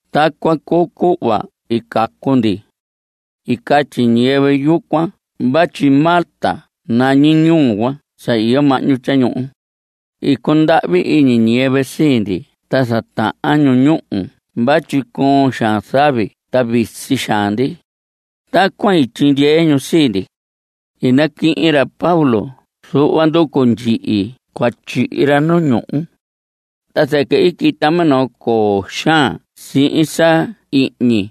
Tacuan cuu cuhva i cacu ndi. I catyi ñiyɨvɨ yucuan vatyi Malta nañi ñuhu cuan sa iyo mahñu tyañuhu. I cundahvi iñi ñiyɨvɨ sii ndi ta zatahan ñu ñúhu vatyi coon xaan zavi ta visi xaan ndi. Tacuan i tyindyee ñu sii ndi. I naquihin ra Pablo zuhva nducu ndyihi cua tyihi ra nu ñúhu. Ta zɨquɨ i quita minoo coo xaan sihin sa ihñi.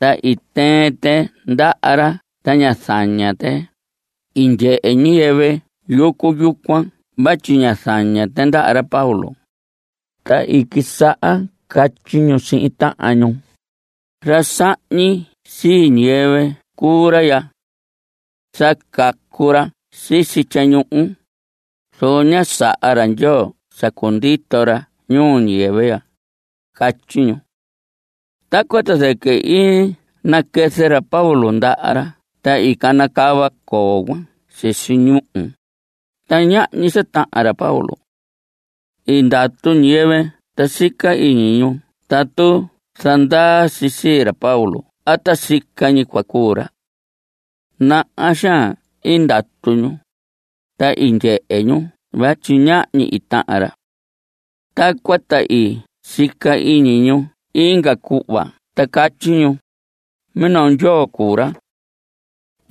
Ta i tɨɨn tɨ ndaha ra ta ñá zaña tɨ. I ndyehe ñiyɨvɨ yucu yucuan vatyi ñá zaña tɨ ndaha ra Pablo, ta i quisaha catyi ñu sihin tahan ñu: Ra sahñi sii ñiyɨvɨ cuu ra ya. Sa cacu ra sisi tyañuhu, zoco ña saha ra Ndyoo sa cundito ra ñuu ñiyɨvɨ ya. Catyi ñu. Tacuan ta zɨquɨ i naquɨzɨ ra Pablo ndaha ra ta i canacava coo cuan sisi ñúhu, ta ñahñi sa tahan ra Pablo. I ndatu ñiyɨvɨ ta sica iñi ñu tatu zandaa si sii ra Pablo a ta sica ñi cua cuu ra. Naha xaan i ndatu ñu, ta i ndyehe ñu vatyi ñahñi i tahan ra. Tacuan ta i sica iñi ñu inga cuhva ta catyi ñu: Minoo ndyoo cuu ra.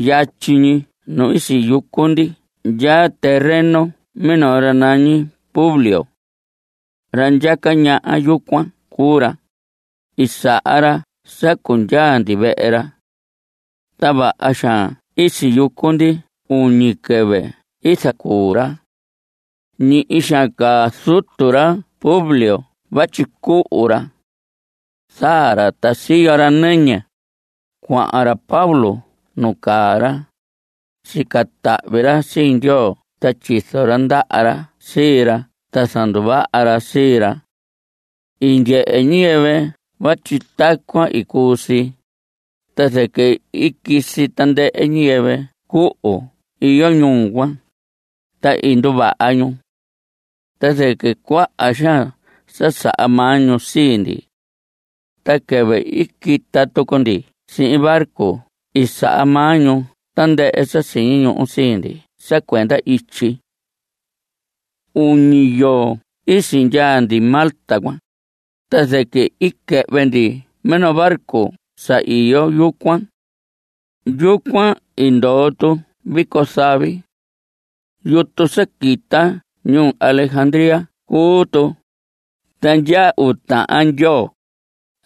Yatyi ñi nu i siyucu ndi ndyaa terreno minoo ra nañi Publio. Ra ndyaca ñaha yucuan cuu ra. I saha ra sa cundyaa ndi vehe ra. Ta vaha xaan i siyucu ndi uñi quɨvɨ i zacuu ra. Ñihi xaan caa zutu ra Publio vatyi cuhu ra. Zaa ra ta siyo ra nɨñɨ. Cuahan ra Pablo nu caa ra. Sica tahvi ra sii Ndyoo ta tyizo ra ndaha ra sii ra ta zanduvaha ra sii ra. I ndyehe ñiyɨvɨ vatyi tacuan i cuu si, ta zɨquɨ i quisi tandɨhɨ ñiyɨvɨ cuhu iyo ñuu cuan. Ta i nduvaha ñu. Ta zɨquɨ cuaha xaan sa saha maa ñu sii ndi. Ta quɨvɨ i quita tucu ndi sihin barco i saha maa ñu tandɨhɨ sa siñi ñuhu sii ndi sa cuenda ityi. Uñi yoo i sindyaa ndi Malta cuan, ta zɨquɨ i quɨhvɨ ndi minoo barco sa iyo yucuan. Yucuan i ndoo tu vico zavi. Yutu sa quita ñuu Alejandría cuu tu, ta ndyaa uu tahan ndyoo,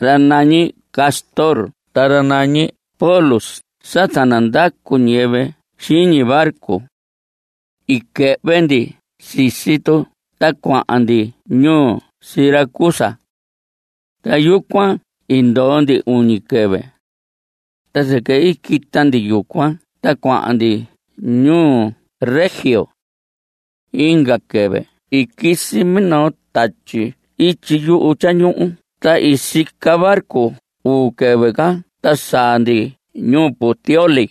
ra nañi Cástor ta ra nañi Pólux sa zanandacu ñiyɨvɨ xiñi barco. I quɨhvɨ ndi sisi tu ta cuahan ndi ñuu Siracusa. Ta yucuan i ndoo ndi uñi quɨvɨ. Ta zɨquɨ i quita ndi yucuan ta cuahan ndi ñuu Regio. Inga quɨvɨ i quisi minoo tatyi ityi yuhu tyañuhu ta i sica barco uu quɨvɨ ca ta i saa ndi ñuu Puteoli.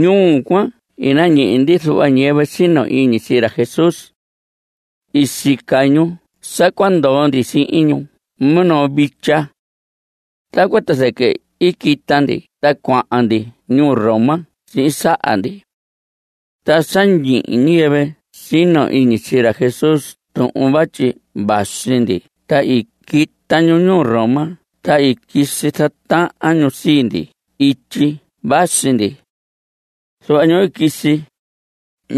Ñuu cuan i nañihi ndi zuhva ñiyɨvɨ sino iñi sii ra Jesús. I sica ñu sa cua ndoo ndi sihin ñu minoo vitya. Tacuan ta zɨquɨ i quita ndi ta cuahan ndi ñuu Roma sihin saha ndi. Ta sa ñihi ñiyɨvɨ sino iñi sii ra Jesús tuhun vatyi vasi ndi ta i quita ñu ñuu Roma ta i quisi zatahan ñu sii ndi ityi vasi ndi. Zuhva ñu i quisi,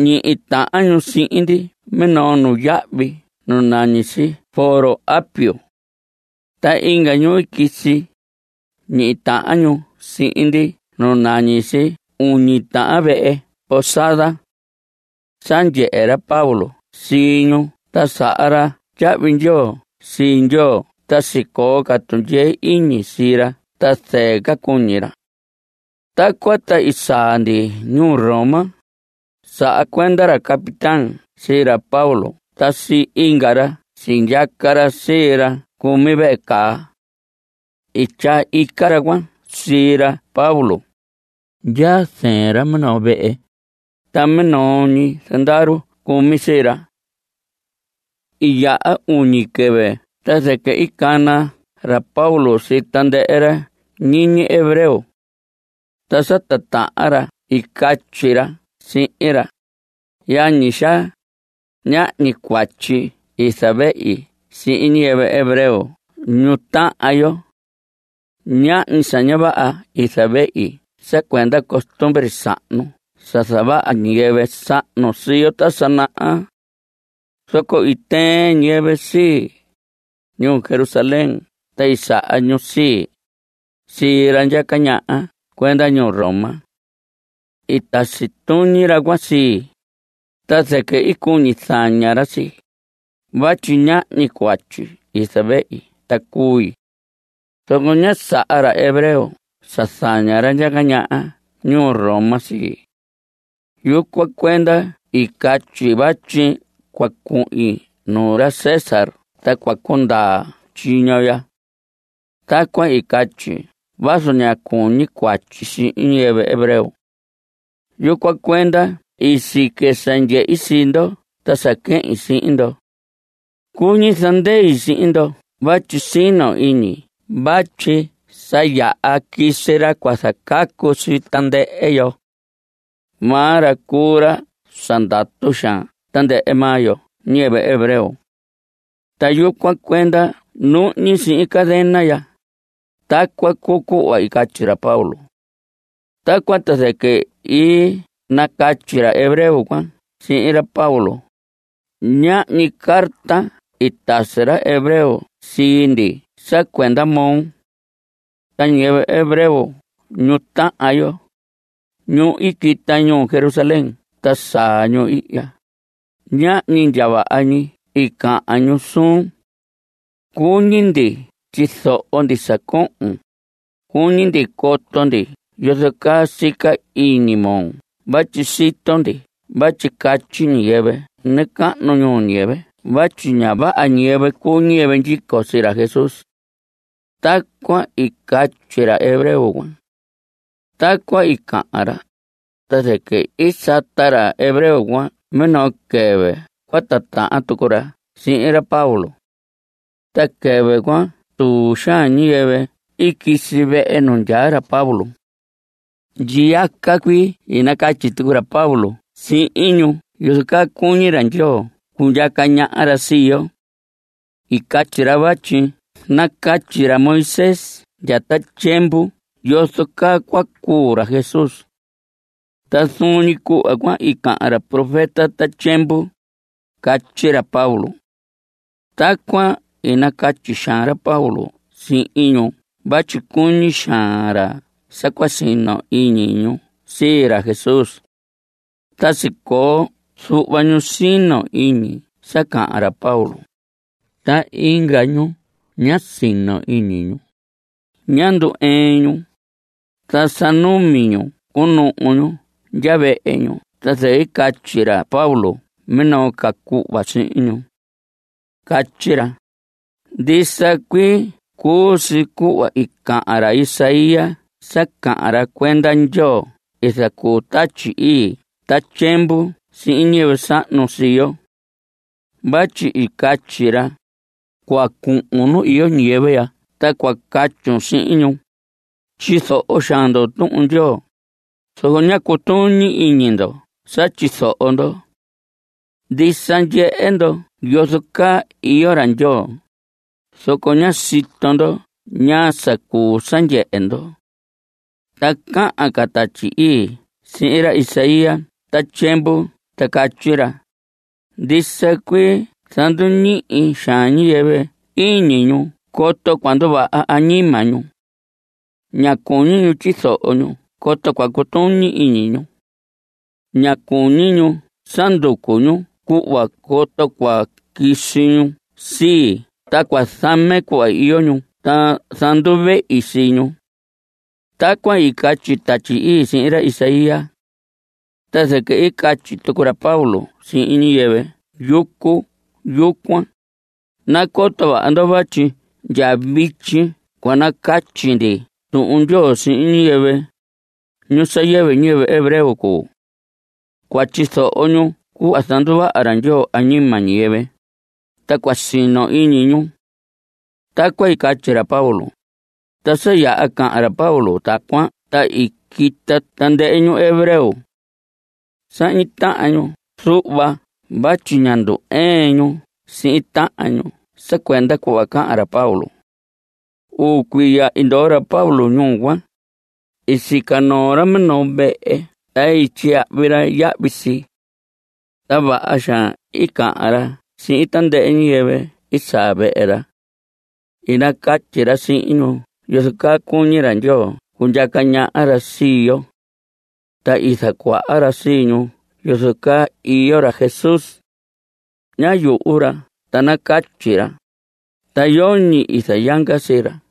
ñihi tahan ñu sihin ndi minoo nuyahvi nu nañi si Foro Apio. Ta inga ñu quisi, ñihi tahan ñu sihin ndi nu nañi si Uñi Tahan Vehe Posada. Sa ndyehe ra Pablo sii ñu ta saha ra tyahvi ndyoo sii Ndyoo ta sicoo ca tundyee iñi sii ra ta zɨɨ ca cuñi ra. Tacuan ta i saa ndi ñuu Roma. Saha cuenda ra capitán sii ra Pablo ta sii inga ra sindyaca ra sii ra cumi vehe caa. I tyaa ica ra cuan sii ra Pablo. Ndyaa zɨɨn ra minoo vehe, ta minoo ñi zandaru cumi sii ra. I yaha uñi quɨvɨ ta zɨquɨ i cana ra Pablo sii tandɨhɨ ra ñiñi hebreo. Ta sa titahan ra i catyi ra sihin ra: Yañi xaa, ñahñi cuatyi i zavehi sihin ñiyɨvɨ hebreo ñu tahan yo. Ñahñi sa ña vaha i zavehi sa cuenda costumbre sahnu sa zavaha ñiyɨvɨ sahnu sii yo ta sa naha. Zoco i tɨɨn ñiyɨvɨ sii, ñuu Jerusalén ta saha ñu sii, sii ra ndyaca ñaha cuenda ñuu Roma. I tasi tuñi ra cuan sii, ta zɨquɨ i cuñi zaña ra sii, vatyi ñahñi cuatyi i zavehi ta cui. Zoco ñá saha ra hebreo sa zaña ra ndyaca ñaha ñuu Roma sii. Yucuan cuenda i catyi vatyi cua cuhin nuu ra César ta cua cundaa tyiño ya. Tacuan i catyi vazu ña cuñi cuatyi sihin ñiyɨvɨ hebreo. Yucuan cuenda i sique sa ndyehi sii ndo ta sa quehin sihin ndo. Cuñi zandei sihin ndo vatyi sino iñi vatyi sa yaha quisi ra cua zacacu sii tandɨhɨ yo. Maa ra cuu ra sa ndatu xaan tandɨhɨ maa yo ñiyɨvɨ hebreo. Ta yucuan cuenda nuhñi sihin cadena ya. Tacuan cuu cuhva i catyi ra Pablo. Tacuan ta zɨquɨ i nacatyi ra hebreo cuan sihin ra Pablo: Ñahñi carta i tasi ra hebreo sii ndi sa cuenda moo. Ta ñiyɨvɨ hebreo ñu tahan yo, ñu i quita ñuu Jerusalén ta saa ñu ihya, ñahñi ndya vaha ñi i cahan ñu suun. Cuñi ndi tyizoho ndi sa cohon. Cuñi ndi coto ndi yozo caa sica iñi moo vatyi sito ndi vatyi catyi ñiyɨvɨ nacahnu ñuu ñiyɨvɨ vatyi ña vaha ñiyɨvɨ cuu ñiyɨvɨ ndyico sii ra Jesús. Tacuan i catyi ra hebreo cuan. Tacuan i cahan ra, ta zɨquɨ i sata ra hebreo cuan minoo quɨvɨ cua titahan tucu ra sihin ra Pablo. Ta quɨvɨ cuan tuu xaan ñiyɨvɨ i quisi vehe nu ndyaa ra Pablo. Ndyiyaca cuii i nacatyi tucu ra Pablo sihin ñu yozo caa cuñi ra Ndyoo cundyaca ñaha ra sii yo. I catyi ra vatyi nacatyi ra Moisés ndya ta tyiemvu yozo caa cua cuu ra Jesús. Ta zuun ñi cuhva cuan i cahan ra profeta ta tyiemvu, catyi ra Pablo. Tacuan i nacatyi xaan ra Pablo sihin ñu vatyi cuñi xaan ra sa cua sino iñi ñu sii ra Jesús. Ta sicoo zuhva ñu sino iñi sa cahan ra Pablo, ta inga ñu ñá sino iñi ñu. Ñá ndu‑ɨɨn ñu. Ta sa numi ñu cunuhu ñu ndya vehe ñu ta zɨquɨ i catyi ra Pablo minoo ca cuhva sihin ñu. Catyi ra: Ndisa cuii cuu si cuhva i cahan ra Isaías sa cahan ra cuenda Ndyoo i zacuu Tatyi Ii ta tyiemvu sihin ñiyɨvɨ sahnu sii yo. Vatyi i catyi ra: Cua cuhun nu iyo ñiyɨvɨ ya ta cua catyun sihin ñu: “Tyizoho xaan ndo Tuhun Ndyoo, zoco ña cutuñi iñi ndo sa tyizoho ndo. Ndisa, ndyehe ndo yozo caa iyo ra Ndyoo, zoco ña sito ndo ñaa sa cuu sa ndyehe ndo.” Ta cahan ca Tatyi Ii sihin ra Isaías ta tyiemvu ta catyi ra: Ndisa cuii zanduñihi xaan ñiyɨvɨ iñi ñu coto cua nduvaha añima ñu. Ña cuñi ñu tyizoho ñu coto cua cutuñi iñi ñu. Ña cuñi ñu sa nducu ñu cuhva, coto cua quisi ñu sii ta cua zame cuhva iyo ñu ta zanduvehi sii ñu. Tacuan i catyi Tatyi Ii sihin ra Isaías. Ta zɨquɨ i catyi tucu ra Pablo sihin ñiyɨvɨ yucu yucuan: Nacoto vaha ndo vatyi ndya vityi cua nacatyi ndi Tuhun Ndyoo sihin ñiyɨvɨ, ñu sa yɨvɨ ñiyɨvɨ hebreo cuu. Cua tyizoho ñu cuhva zanduvaha ra Ndyoo añima ñiyɨvɨ, ta cua sino iñi ñu. Tacuan i catyi ra Pablo. Ta sa yaha cahan ra Pablo tacuan ta i quita tandɨhɨ ñu hebreo. Sahñi tahan ñu zuhva vatyi ñá ndu‑ɨɨn ñu sihin tahan ñu sa cuenda cuhva cahan ra Pablo. Uu cuiya i ndoo ra Pablo ñuu cuan. I sica noo ra minoo vehe ta tyiyahvi ra yahvi si. Ta vaha xaan i cahan ra sihin tandɨhɨ ñiyɨvɨ i saa vehe ra. I nacatyi ra sihin ñu yozo caa cuñi ra Ndyoo cundyaca ñaha ra sii yo. Ta i zacuaha ra sii ñu yozo caa iyo ra Jesús. Ñá yuhu ra ta nacatyi ra, ta yoñi i zayanga sii ra.